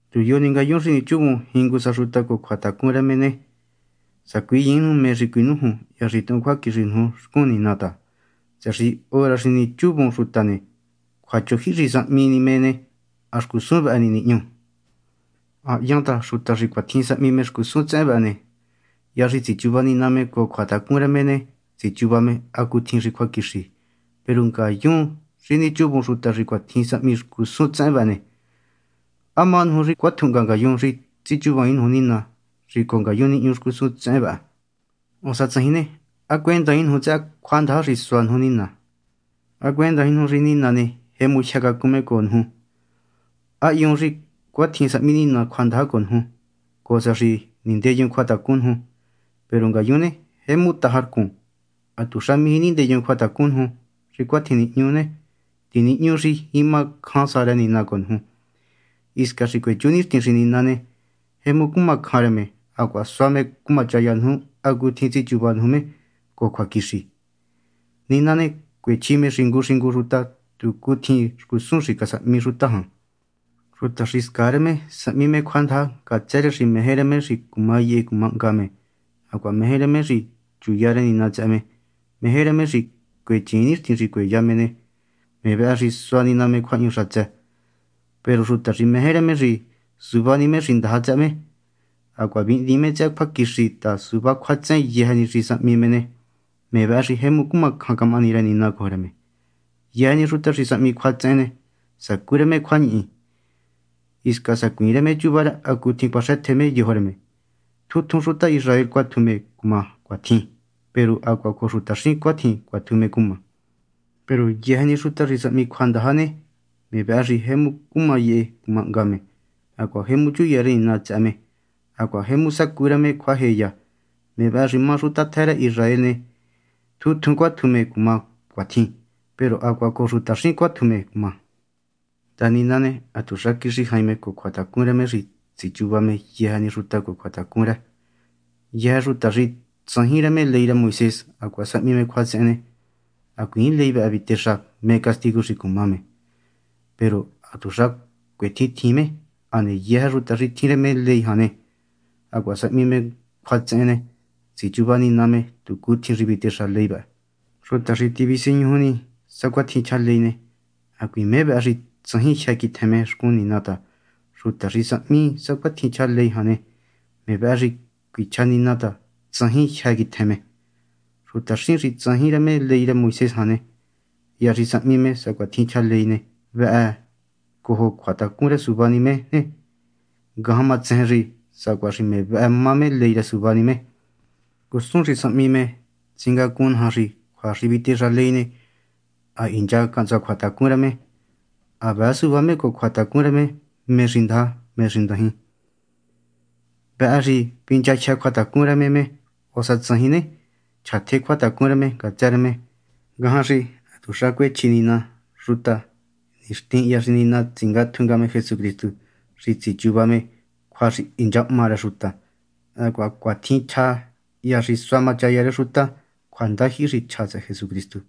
Tu yo ni ngayun xi nichuvun jingu sa xuta cojo cjuatacun rë me ne, sacuiyiin nuju mé xi cuinújun hya xi tuhun cjuaquixi nuju xcun Nina ta, tsëhë xi hora xi nichuvun xuta ne, cjuachojyihi xi sahmi ni me ne, ha xcusun vëhë ni nihñu. Ha hyan ta xuta xi cuatjin sahmi xcusun tsehen vëhë ne, hya xi tsichuva Nina me cojo cjuatacun rë me ne, tsichuva me hacutjin xi cjuaquixi. Peru ngayun xi nichuvun xuta xi cuatjin sahmi xcusun tsehen vëhë ne, ¿há má nuju xi cuatjuhnga ngayun xi tsichuvaain nuju Nina xi cojo ngayun nihñu xcusun tsehen vëhë? O há tsajin ne, ¿há cuendaain nuju tsëhë cjuandaja xi sua nuju Nina? ¿Há cuendaain nuju xi Nina ne, jemu jyë cacun me cojo nuju? ¿Há hyuun xi cuatjin sahmi Nina cjuandaja cojo nuju, cojo sa xi nindeyun cjuatacun nuju? Peru ngayun ne, jemu taja rcun, hatuxa mijí nindeyun cjuatacun nuju. Xi cuatjin nihñu ne, tinihñu xi jima cjan sa rë Nina cojo nuju, hisca xi cuechú nixtin xi Nina ne, jemu cuma cjan rë me hacuaha sua me cumachaya nuju hacutjin tsichuva nuju me cojo cjuaquixi. Nina ne cuechji me xingu xingu xuta tu cutjin xcusun xi casahmi xuta jan. Xuta xi scaa rë me sahmi me cjuandaja ngatsë rë xi meje rë me xi cuma yehe cuma hnga me, hacuaha meje rë me xi chuya rë Nina tsëhë me. Meje rë me xi cuechiin nixtin xi cueya me ne, me vëhë xi sua Nina me cjuahñu xatsë. Peru xuta xi meje rë me xi suvá ni me xi ndaja tsëhë me, hacuaha vihndiin me tsëhë cjuaquixi ta suvá cjuatsehen yëjë ni xi sahmi me ne, me vëhë xi jemu cuma cjan camahani rë Nina cojo rë me. Yëjë ni xuta xi sahmi cjuatsehen ne, sacú rë me cjuañihi, hisca sacuiin rë me chuva rë hacutjin cuaxëtje me yojo rë me. Tjun tjun xuta Israel cuatju me cuma cuatjin, peru hacuaha cojo xutaxín cuatjin cuatju me cuma. Peru yëjë ni xuta xi sahmi cjuandaja ne, me vëhë xi jemu cuma yehe cuma hnga me, hacuaha jemu chuya rë Nina tsëhë me, hacuaha jemu sacú rë me cjuajeya. Me vëhë xi má xuta tjë rë Israel ne, tjun tjun cuatju me cuma cuatjin, peru hacuaha cojo xutaxín cuatju me cuma. Ta Nina ne, hatuxa quixi jain me cojo cjuatacun rë me xi tsichuva me yëjë ni xuta cojo cjuatacun rë. Yëjë xuta xi tsajin rë me ley rë Moisés hacuaha sahmi me cjuatsehen ne, hacuiin ley vëhë vitexa mé castigu xi cuma me; peru hatuxa cuetjintjiin me. Hane yëjë xuta xi tjin rë me ley jan hacuaha sahmi me cjuatsehen ne, tsichuva Nina me tu cutjin xi vitexa ley vëhë. Xuta xi tu visiñuju ni sacuatjin chja ley ne, hacuiin me vëhë xi tsajin jyë́ quitjen me xcun Nina ta xuta xi sahmi sacuatjin chja ley jan ne, me vëhë xi cuichja Nina ta tsajin jyë́ quitjen me. Xutaxín xi tsajin rë me ley rë Moisés jan ne, hya xi sahmi me sacuatjin chja ley vëhë cojo cjuatacun rë suvá ni me ne, ngajan ma tsejen xi sacuaha xi me vëhë má me ley rë suvá ni me. Xcusun xi sahmi me tsingacun naja xi cjua xi vitexa ley ne, ha hincha cahntsua cjuatacun rë me. Ha vëë suvá me cojo cjuatacun rë me mé xi ndaja, mé xi ndajin. Vëhë xi vinchajyë́ cjuatacun rë me me, o sa tsajin ne, chjatje cjuatacun rë me ngatsë rë me. Ngajan xi hatuxa cuechji Nina xuta nixtin hya xi Nina tsingatju nga me Jesucristu xi tsichuva me cjua xi hinchahma rë xuta. Hacuaha cuatjin chjá hya xi suá machaya rë xuta cjuandajyihi xi chja tsëhë Jesucristu.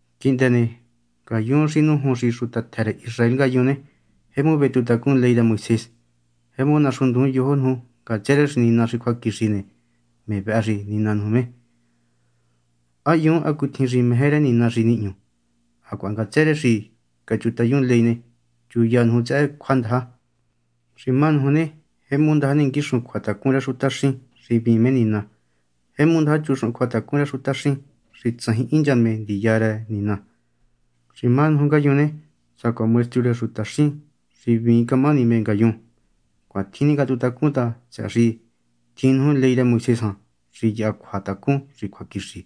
Quihndë ne, ngayun xi nújun xi xuta tjë rë Israel ngayun ne, jemu vetuhuntacun ley rë Moisés. Jemu naxunndujun yojo nuju ngatsë rë xi Nina xi cjuaquixi ne, me vëhë xi nina nuju me. Ha hyun hacutjin xi meje rë Nina xi nihñu; hacuaha ngatsë rë xi cachutayun ley ne, chuya nuju tsëhë cjuandaja. Xi má nuju ne, jemu ndaja ninguixun cjuatacun rë xutaxín xi hvíin me Nina; jemu ndaja chuxuhun cjuatacun rë xutaxín xi tsajin hincha me ndiya rë Nina. Xi má nuju ngayun ne, sacuaha maestru rë xutaxín xi hvíin camahani me má ngayun. Cuatjin ningatuhuntacun ta, tsëhë xi tjin nuju ley rë Moisés jan xi yaha cjuatacun xi cjuaquixi.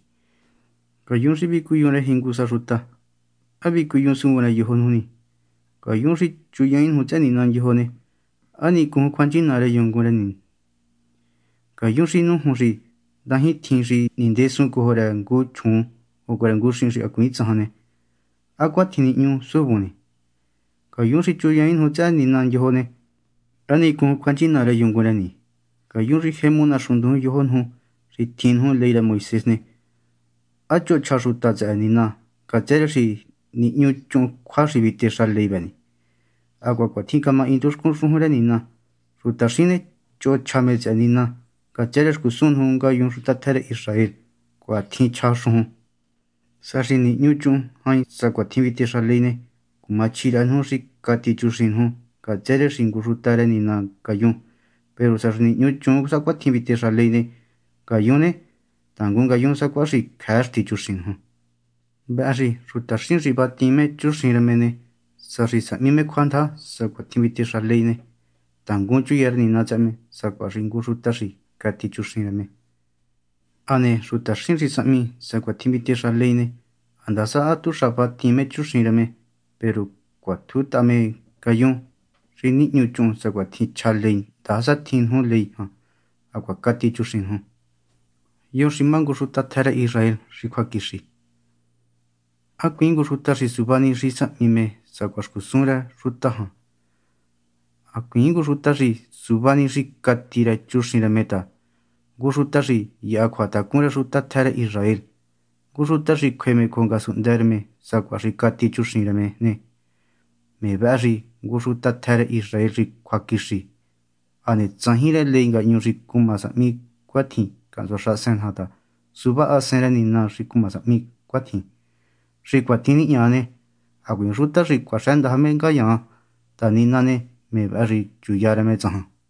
Ngayun xi vicuyun rë jingu sa ne, ¿há vicuyuun suvun rë yojo nuju ni? Ngayun xi chuyiin nuju tsëhë nina ndyojo ne, ¿há nichujun cjuanchina rë yungun rë ni? Ngayun xi nújun xi ndajintjin xi nindesun cojo rë ngu chjuun, o cojo ngu xihin xi hacuiin tsajan ne, ¿há cuatjin nihñu suvun ni? Ngayun xi chuyiin nuju tsëhë nina ndyojo ne, ¿há nichujun cjuanchina rë yungun rë ni? Ngayun xi jemu naxunndujun yojo nuju xi tjin nuju ley rë Moisés ne, ¿há choho chja xuta tsëhë Nina ngatsë rë xi nihñuchuun cjua xi vitexa ley vë ni? Hacuaha cuatjin camahindu xcun xujun rë Nina: “Xutaxín ne, choho chja me tsëhë Nina, ngatsë rë xcusun nuju ngayun xuta tjë rë Israel.” Cuatjin chja xujun. Sa xi nihñuchuhun jain sacuatjin vitexa ley ne, cumachji rëhë nuju xi cati chuxin nuju ngatsë rë xi ngu xuta rë Nina ngayun; peru sa xi nihñuchuun sacuatjin vitexa ley ne, ngayun ne, tangun ngayun sacuaha xi cjëë xtí chuxin nuju. Vëhë xi xutaxín xi vatiin me chuxin rë me ne, sa xi sahmi me cjuandaja sacuatjin vitexa ley ne, tangun chuya rë Nina tsëhë me sacuaha xi ngu xuta xi cati chuxin rë me. Hane xutaxín xi sahmi me sacuatjin vitexa ley ne, handasa hatuxa vatiin me chuxin rë me, peru cuatjutaha nuju me, ngayun xi nihñuchuun sacuatjin chja ley handasa tjin nuju ley jan hacuaha cati chuxin nuju. ¿Yo xi má ngu xuta tjë rë Israel xi cjuaquixi? Hacuiin ngu xuta xi suvá ni xi sahmi me sacuaha xcusun rë xuta jan, hacuiin ngu xuta xi suvá ni xi cati rë chuxin rë ta, ngu xuta xi yaha cjuatacun rë xuta tjë rë Israel, ngu xuta xi cjuë me cojo ngasunhndë rë me sacuaha xi cati chuxin rë me, me vëhë xi ngu xuta tjë rë Israel xi cjuaquixi. Hane tsajin rë ley ngahñu xi cuma sahmi cuatjin cahntsua xahasen naja ta suvá Hasen rë Nina xi cuma sahmi cuatjin. Xi cuatjin nihña ne, hacuiin xuta xi cuaxëndaja me tsajan ta Nina ne, me vëhë xi chuya rë me tsajan.